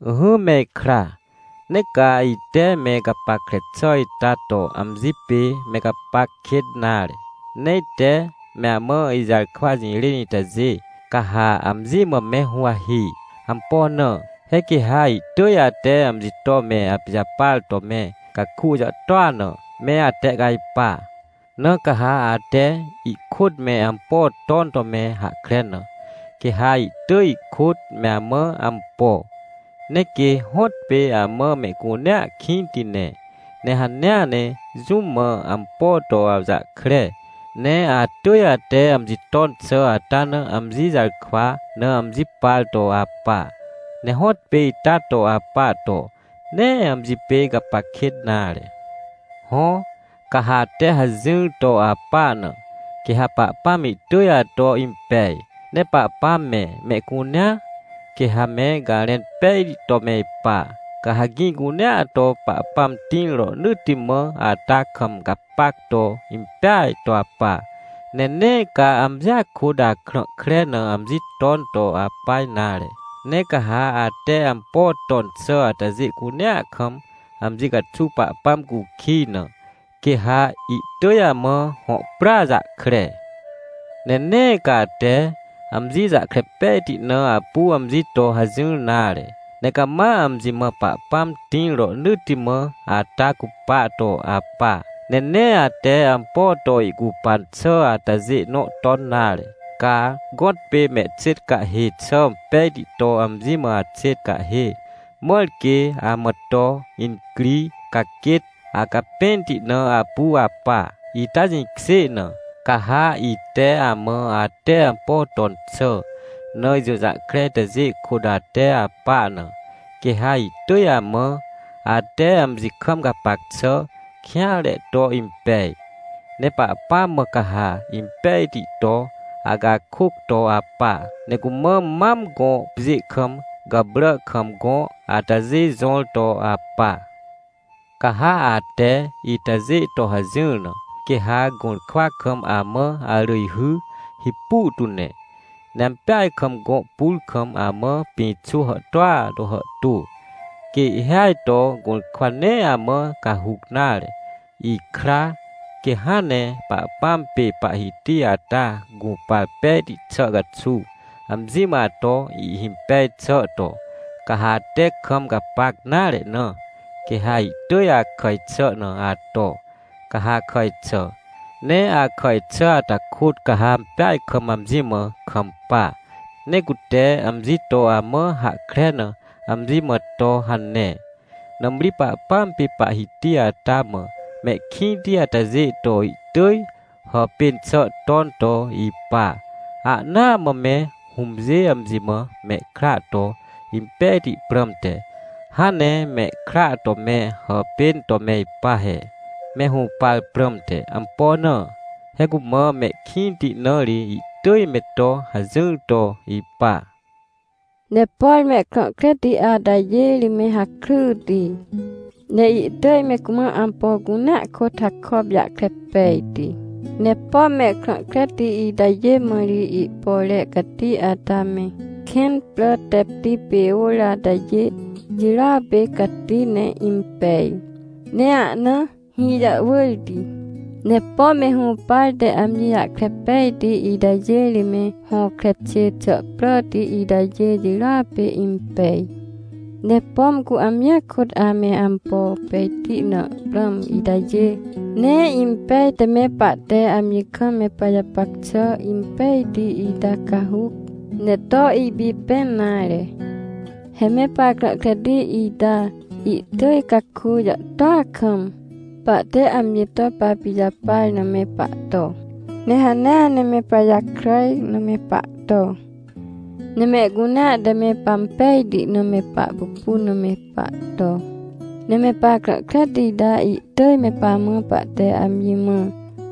Ỹhỹ me ikra, nee ca ite me gapackre xà ita to amji pê me gapac kêt nare, ne ite me amã ijarkwa jirên itajê, ca ha amji mã me huwahi. Ampo na? He quê ha ihtỳj ate amji to me apijapar to me caku jàhtôa na, me atehcajpa. Na ca ha ate ihkôt me ampo ton to me hahkre na, quê ha ihtỳj ihkôt me amã ampo. Ne quê hõtpê amã mehcunea kĩnti ne, ne hanea ne jũm mã ampo to awjahkre, ne atỳj ate amji ton xà ata na amji jarkwa na amji par to apa. Ne hõtpê ita to apa to, nee amji pê gapac kêt nare. Hõ, ca ha ate hajỹr to apa na, quê ha Pahpãm ihtỳj ato impej. Ne Pahpãm me, mehcunea, quê ha me garẽn pejti to me ipa. Ca ha gĩ cunea to Pahpãm tĩr rohnỳtti mã ata kam gapac to impeaj to apa, ne nee ca amjia kôt akrã kre na amji ton to apa nare. Ne ca ha ate ampo ton xà atajê cunea kam amji caxuw Pahpãm cukij na, quê ha ihtỳj amã hõ prya jahkre. Ne nee ca ate amji jahkre pejti na apu amji to hajỹr nare, ne cama amji mã Pahpãm tĩr rohnỳtti mã ata cupa to apa. Ne nee ate ampo to ihcupan xà atajê nõ ton nare. Ca gõtpê mehxêt cahê xà pejti to amji mã axêt cahhê, mãr quê amã to incri, ca quêt acapẽnti na apu apa, ita jĩkjê na, ca ha ite amã ate ampo ton xà na ijũjahkre itajê kôt ate apa na, quê ha ihtỳj amã, ate amji kam gapac xà kêanre to impej. Ne Pahpãm mã ca ha impejti to acakôc to apa. Ne cumã mam gõ pjê kam gàprà kam gõ atajê jõr to apa. Ca ha ate itajê to hajỹr na, quê ha gũrkwa kam amã arỳjhy hipu tu ne, ne ampeaj kam gõ pur kam amã pĩxô hàhtôa to hàhtô, quê ihhêaj to gũrkwa nee amã cahuc nare. Ikra, quê hãn ne Pahpãm pê Pahhiti ata gũpar pejti xà caxuw, amji mã ato ihhimpej xà to, ca ha ate kam gapac nare na, quê ha ihtỳj akàj xà na ato, ca ha akàj xà. Ne akàj xà ata kôt ca ha ampeaj kam amji mã kampa, ne cute amji to amã hahkre na amji mã to hane. Nãmri Pahpãm pê Pahhiti ata mã mehkĩnti atajê to ihtỳj hàpên xà ton to ipa, ahnaa mã me hũmjê amji mã mehkra to impejti prãmte, hãn ne mehkra to me hàpên to me ipa he, me hũpar prãmte. Ampo na? He cumã mehkĩnti na ri ihtỳj me to hajỹr to ipa. Ne por mehkrã kreti atajê ri me hakryti, ne ihtỳj me cumã ampo cunea kôt hakop jahkre pejti. Ne pom mehkrã kreti itajê mã ri ihpore cati ata me, kẽn prà tepti pê ôr atajê jirôa pê cati ne impej, ne ahna hĩ jàhwỳrti. Ne pom me hũpar te amji jahkre pejti itajê ri me hõkre xê xà pràti itajê jirôa pê impej. Ne pom cu amjia kôt ame ampo pejti na prãm itajê, nee impej te me pahte amji kam me pajapac xà impejti ita cahuc, ne to ipipẽn nare. He me pahkrã kreti ita ihtỳj caku jàhtôa kam, pahte amji to papijapar na me pahto, ne hanea ne me pajakràj na me pahto, ne mehcunea te me pampejti na me pahpupun na me pahto. Ne me pahkrã kreti ita ihtỳj me pamã pahte amji mã,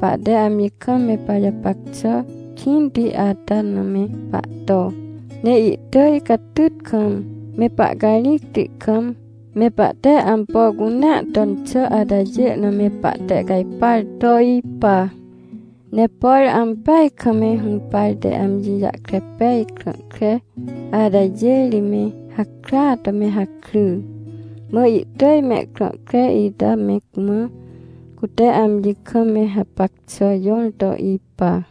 pahte amji kam me pajapac xà kĩnti ata na me pahto, ne ihtỳj catyt kam, me pahcarĩcti kam, me pahte ampo cunea ton xà atajê na me pahtehcajpar to ipa. Ne por ampeaj kam me hũpar te amji jahkre pej krã kre atajê ri me hakrya to me hakry, mã ihtỳj mehkrã kre ita me cumã cute amji kam me hapac xà jõr to ipa.